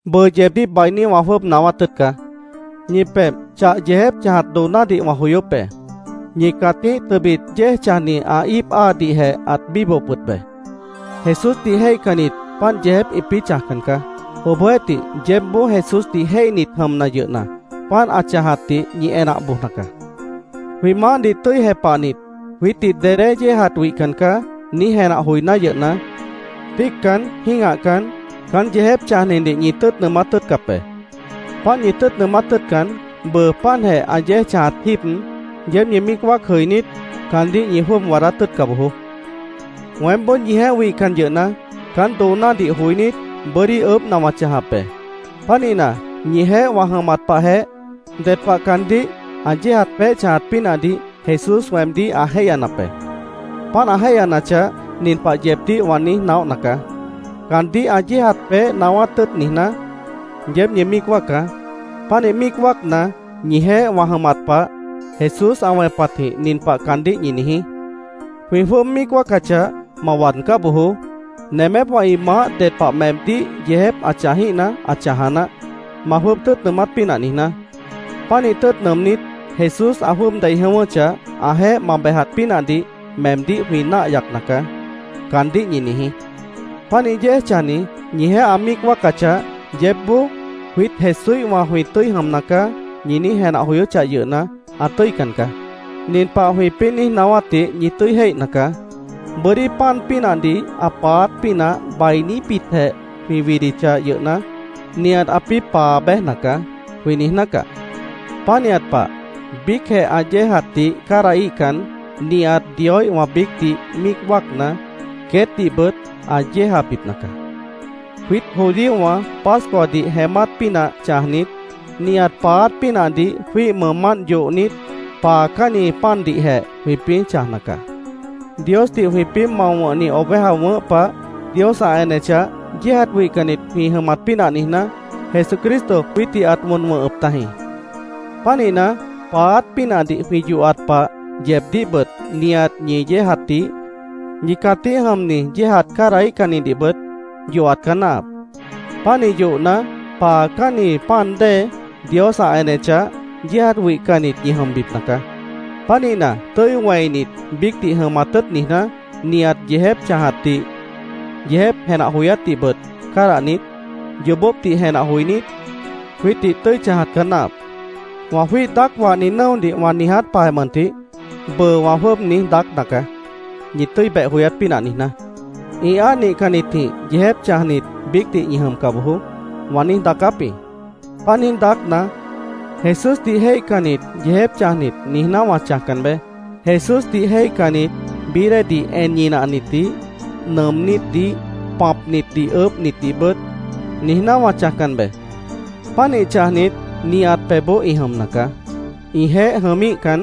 Bʉʉ yeebdíh bainí wã jwʉ́ʉb naáwát tʉ́ʉt caá. Ñi pebh chah yeejép chãjat doonádih wã joyóp be. Ñi cãtíh tʉbit yéej chãjni ã íip áadihjeh ãt bíbohop wʉt be. Jesúsdih jéihcannit páant yeejép ĩpĩ́ chãjcan caá. Obohjeéhtih, yeébboó Jesúsdih jéihnit jʉmna yʉhna, páant ã chãjatdih ñi enah bojna caá. “Jwĩ Maáhdih tʉ́i jepahnit, jwiítdih dedé yéejat wihcan caá”, niíj jenah joiná yʉhna, tíiccan, jĩ́gahcan, caán yeejép chãjnidih ñi tʉ́ʉt nʉʉmát tʉ́ʉtcap be. Páant ñi tʉ́ʉt nʉʉmát tʉ́ʉtcan, bʉʉ páantjeh ã yéej chãjat jíib, yeéb ñi míic wáac jʉinít, caandíh ñi jwʉ́ʉb waadát tʉ́ʉtca bojoó. Weémboó ñijeéh wihcan yʉhna, caán doonádih joinít, bʉ́dí ʉʉ́bhna wã chãjap be. Pánihna, ñijeéh wã jʉmat pahjeh, ded pah caandíh ã yéejat peéh chãjat pínahdih Jesús weemdíh ã jéihyanap be. Páant ã jéihyanachah, nin pah yeebdíh wã niíj naóhna caá: Caandíh ã yéejat peéh naáwát tʉ́ʉt niijná, yeéb ñi míic wáacá. Pánih míic wáacna, ñijeéh wã jʉmat pah, Jesús ã wẽpatjĩh nin pah caandíh ñi niijí: “Jwĩ jwʉ́ʉb míic wáacachah, ma waadcá bojoó. Nemépwã ĩ maáh ded pah meemdíh yeejép ã chãjíhna, ã chãja naáh, ma jwʉ́ʉb tʉ́ʉt nʉʉmát pínah niijná. Pánih tʉ́ʉt nʉʉmnít, Jesús ã jwʉ́ʉb dei jʉ̃ʉ́wʉ́chah, ãjeéh ma bejat pínahdih meemdíh jwĩ náah yacna caá”, caandíh ñi niijí. Pánih yéej chãjni ñijeéh ã míic wáacachah, yeébboó “Jwiít Jesúíhwã jwĩ tʉ́i jʉmna caá”, ñi niíj jenah joyóchah yʉhna, ã tʉ́ican caá. Nin pah jwĩpĩ́ niíj naáwátdih ñi tʉ́i jéihna caá: “Bʉ́dí pan pínahdih ã paáát pínah bainíbitjeh jwĩ widichah yʉhna, nihat ãpĩ́ paa béjna caá”, jwĩ niijná caá. Pánihat pah, biícjeh ã yéejatdih cádahíhcan, nihat Dioíhwã biícdih míic wáacna, queétdihbʉt ã yéejabipna caá. Jwiít judíowã Pascuadih jeémát pínah chãjnit, nihat paáát pínahdih jwĩ́ih mʉʉmánt yohnit, paacánni pandihjeh jwĩpĩ́ chãjna caá. Diosdih jwĩpĩ́ mao wʉ̃hni oveja wʉ̃ʉ́h pah, Dios ã enechah, yéejat wihcannit jwĩ jʉmat pínah niijná, Jesucristo jwiítdih ãt wʉn wʉ̃hʉp tajĩ. Pánihna, paáát pínahdih jwĩ yohat pah yeebdíhbʉt nihat ñi yéejatdih, ñi cãtíh jʉmni yéejat cádahíhcannidihbʉt yohat caá náahap. Pánih yohna, paacánni pan dée, Dios ã enechah, yéejat wihcannit ñi jʉmbipna caá. Pánihna, tʉ́i wẽinit, biícdih jʉmat tʉ́ʉt niijná, nihat yeejép chãjatdih, yeejép jenah joyátdihbʉt cádahnit, yoobópdih jenah joinít, jwiítdih tʉ́i chãjat caá náahap. Wã jwíih daác wahni nʉ́odih wã niijátji pah mʉntih, bʉʉ wã jwʉ́ʉb niíj daácna caá, ñi tʉ́i beh joyát pínah niijná. “Ĩ áa nihcannitjĩh yeejép chãjnit biícdih ñi jʉmca bojoó”, wã niíj daacáp jĩ. Páant niíj daácna, “Jesúsdih jéihcannit yeejép chãjnit”, niijná wã chãjcan be. “Jesúsdih jéihcannit bií déedih en ñinahnitdih, nʉʉmnítdih, pãpnidih ʉʉ́bhnitdihbʉt”, niijná wã chãjcan be. Pánih chãjnit nihat pebhboó ĩ jʉmna caá. Ĩjeéh jʉmíhcan,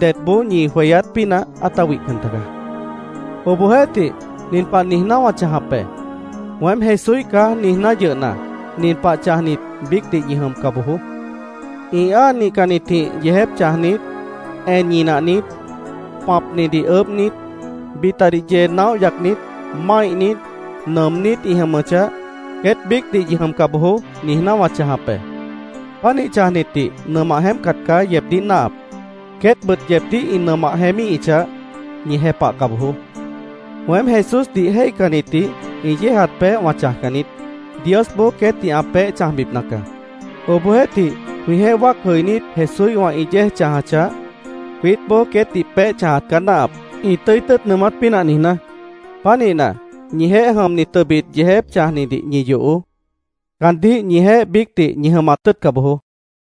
dedboó ñi jweyát pínah ãta wihcan taga. Obohjeéhtih, nin pah niijná wã chãjap be: “ ‘Weém Jesúíh caá’, niijná yʉhna, nin pah chãjnit biícdih ñi jʉmca bojoó: ĩ áa nihcannitjĩh yeejép chãjnit, en ñinahnit, pãpnidih ʉʉ́bhnit, bitadih yee naóh yacnit, máihnit, nʉʉmnít ĩ jʉmʉchah, queét biícdih ñi jʉmca bojoó”, niijná wã chãjap be. Pánih chãjnitdih nʉmah jeémpcat caá yeebdíh náahap. Queétbʉt yeebdíh ĩ nʉmah jeémíhichah, ñi jepahca bojoó. Weém Jesúsdih jéihcannitdih ĩ yéejat peéh wã chãjcan niít. Diosboó queétdih ã peéh chãjbipna caá. Obohjeéhtih jwĩjeéh wáac jʉinít Jesúíhwã ĩ yéej chãjachah, jwiítboó queétdih peéh chãjat caá náahap, ĩ tʉ́i tʉ́ʉt nʉʉmát pínah niijná. Pánihna, ñijeéh jʉmni tʉbit yeejép chãjnidih ñi yohoó. Caandíh ñijeéh biícdih ñi jʉmat tʉ́ʉtca bojoó.